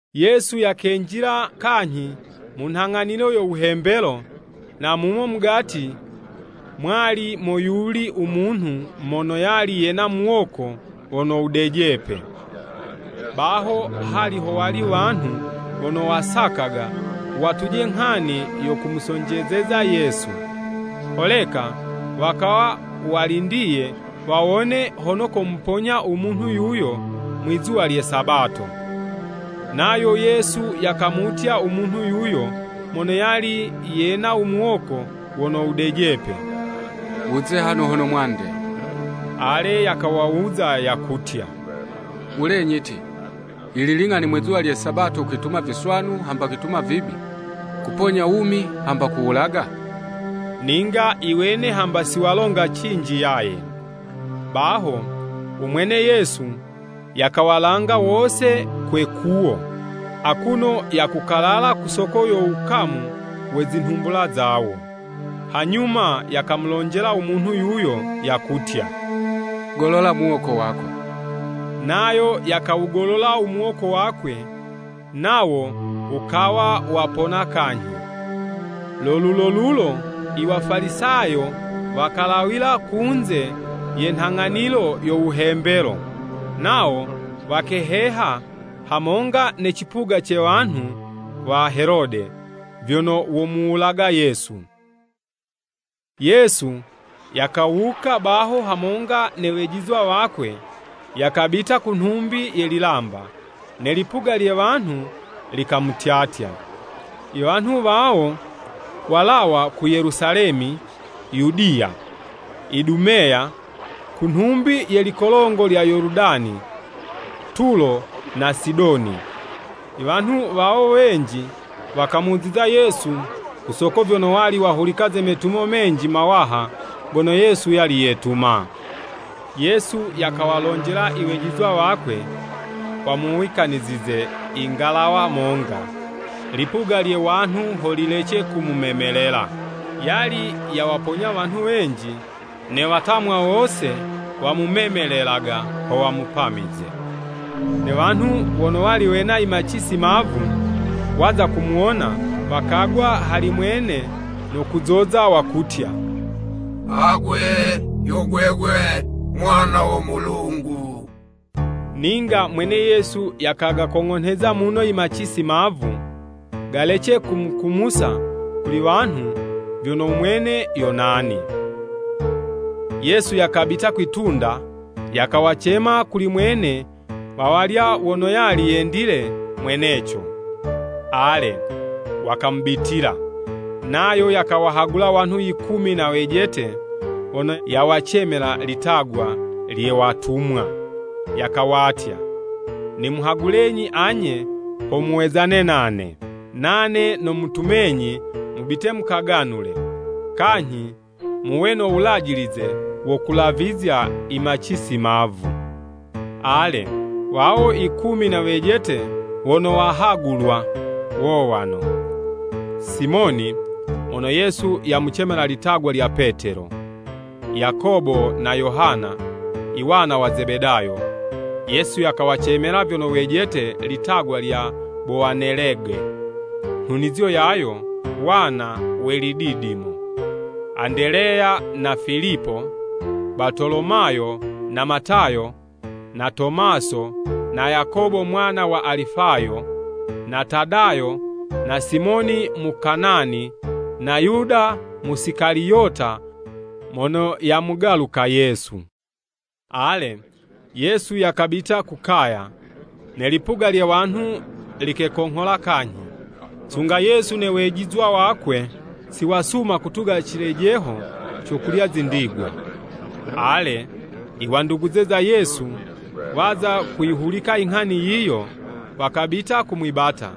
Yesu yakenjila kanyhi mu nghang'anilo yo wuhembelo, na mumo mugati mwali moyuli u munhu mono yali yena muwoko wono wudejepe. Baho hali howali wanhu wono wakasaka watuje nghani yo kumusonjezeza Yesu, holeka wakawa walindiye, wawone hono komuponya u munhu yuyo, mwizuwa lye Sabato. Nayo Yesu yakamutya u munhu yuyo mono yali yena u muwoko wono wudejepe, “Wuze hano hono mwande!” Ale yakawawuza, yakutya, “Wulenyi ti, yili ling'ani mwizuwa lye Sabato kwituma viswanu hamba kwituma vibi? Kuponya wumi hamba kuwulaga?” Ninga iwene hamba siwalonga cinji yaye. Baho u mwene Yesu yakawalanga wose kwe 'kuwo, akuno yakukalala ku soko yo wukamu we zinhumbula zawo. Hanyuma yakamulonjela umunhu yuyo, yakutya, “Golola muwoko wako!” Nayo yakawugolola u muwoko wakwe, nawo wukawa wapona kanyhi. Lo lulolulo i Wafalisayo wakalawila kunze ye nhang'anilo yo wuhembelo, nawo wakeheha hamonga ne cipuga ce wanhu wa Helode, vyono womuwulaga Yesu. Yesu yakawuka baho hamonga ne wejizwa wakwe, yakabita ku nhumbi ye lilamba, ne lipuga lye wanhu likamutyatya. I wanhu wawo, walawa ku Yelusalemi, Yudiya, Idumeya, ku nhumbi ye likolongo lya Yoludani, Tulo na Sidoni. Iwanhu wawo wenji, wakamuziza Yesu ku soko vyono wali wahulika ze metumo menji mawaha, gono Yesu yali yetuma. Yesu yakawalonjela iwejizwa wakwe, wamuwikanizize ingalawa monga, lipuga lye wanhu ho lilece kumumemelela. Yali yawaponya wanhu wenji, ne watamwa wose wamumemelelaga ho wamupamize. Ne wanhu wono wali wena i macisi mavu, waza kumuwona, wakagwa hali mwene no kuzoza, wakutya, “Agwe yo gwegwe Mwana wo Mulungu!” Ninga mwene Yesu yakagakong'onheza muno i macisi mavu, galece kumukumusa kuli wanhu vyono u mwene yo nani. Yesu yakabita kwi'tunda, yakawacema kuli mwene wawalya wono yali yendile mweneco. Ale, wakamubitila, Nayo yakawahagula wanhu yikumi na wejete wono yawacemela litagwa lye “Watumwa,” yakawatya, nimuhagulenyi anye ho muwezane nane. Nane nomutumenyi mubite mukaganule, kanyhi muwe no wulajilize wo kulavizya imacisi mavu. Ale, wawo ikumi na wejete wono wahagulwa, wowano, Simoni (mono Yesu yakamucemela litagwa lya Petelo), Yakobo na Yohana, iwana wa Zebedayo (Yesu yakawacemela vyono wejete litagwa lya Bowanelege, nhunizo yayo “Wana we lididimo,”) Andeleya na Filipo, Batolomayo, na Matayo, na Tomaso, na Yakobo mwana wa Alifayo, na Tadayo, na Simoni Mukanani, na Yuda Musikaliyota mono yamugaluka Yesu. Ale, Yesu yakabita ku kaya. Ne lipuga lye wanhu likekonghola kanyhi, sunga Yesu ne wejizwa wakwe siwasuma kutuga cilejeho co kulya zindigwa. Ale, iwanduguze za Yesu waza kuyihulika inghani yiyo, wakabita kumwibata,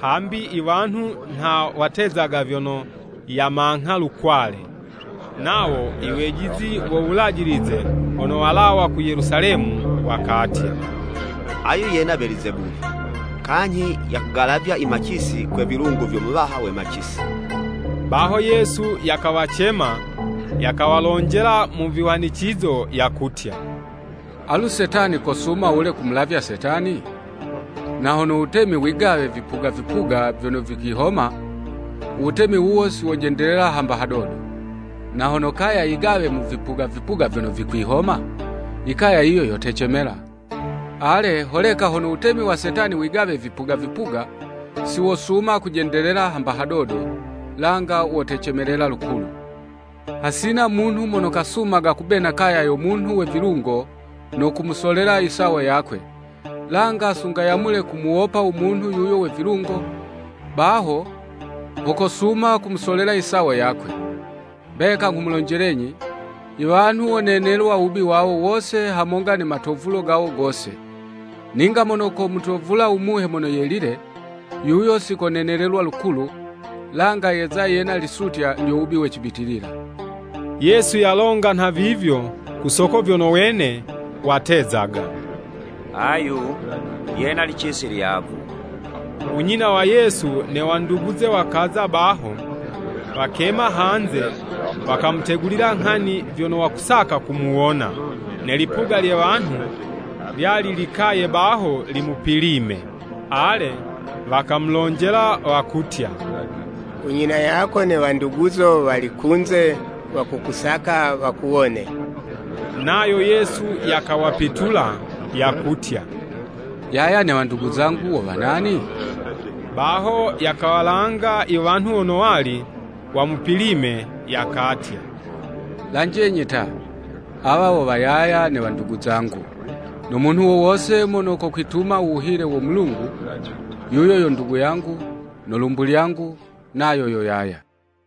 hambi i wanhu nha watezaga vyono yamangha lukwale. Nawo iwejizi wo Wulajilize wono walawa ku Yelusalemi, wakatya, “Ayu yena Belizebuli! Kanyhi, yakugalavya i macisi, kwe vilungo vyo muwaha we macisi.” Baho Yesu yakawacema, yakawalonjela mu vihwanicizo, yakutya, “Alu Setani kosuma wule kumulavya Setani? Na hono wutemi wigawe vipuga vipuga vyono vikwihoma, uwutemi wuwo siwojendelela hamba hadodo. Na hono kaya yigawe mu vipuga vipuga vyono vikwihoma, i kaya yiyo yotecemela. Ale, holeka na hono wutemi wa Setani wigawe vipuga vipuga, siwosuma kujendelela hamba hadodo, langa wotecemelela lukulu. “Hasina munhu mono kasumaga kubena kaya yo munhu we vilungo no kumusolela isawo yakwe, langa sunga yamule kumuwopa u munhu yuyo we vilungo, baho ho kosuma kumusolela isawo yakwe. “Mbeka nghumulonjelenyi, iwanhu wonenelwa wubi wawo wose hamonga ne matovulo gawo gose. Ninga mono komutovula u Muhe Mono Yelile, yuyo sikonenelelwa lukulu, langa yeza yena lisutya lyo wubi we cibitilila.” (Yesu yalonga nhavivyo ku soko vyono wene watezaga, “Ayu yena licisi lyavu.”) U nyina wa Yesu ne wanduguze wakaza baho, wakema hanze, wakamutegulila nghani vyono wakusaka kumuwona. Ne lipuga lye wanhu lyali likaye baho limupilime. Ale, wakamulonjela, wakutya, “U nyina yako ne wanduguzo wali kunze wakukusaka wakuwone.” Nayo Yesu yakawapitula, yakutya, “Yaya ne wandugu zangu wo wa nani?” Baho yakawalanga i wanhu wono wali wamupilime, yakatya, “Lanjenyi ta! Awa wo wa yaya ne wandugu zangu. No munhu wo wose mono kokwituma u wuhile wo Mulungu, yuyo yo ndugu yangu, no lumbu lyangu nayo yo yaya.”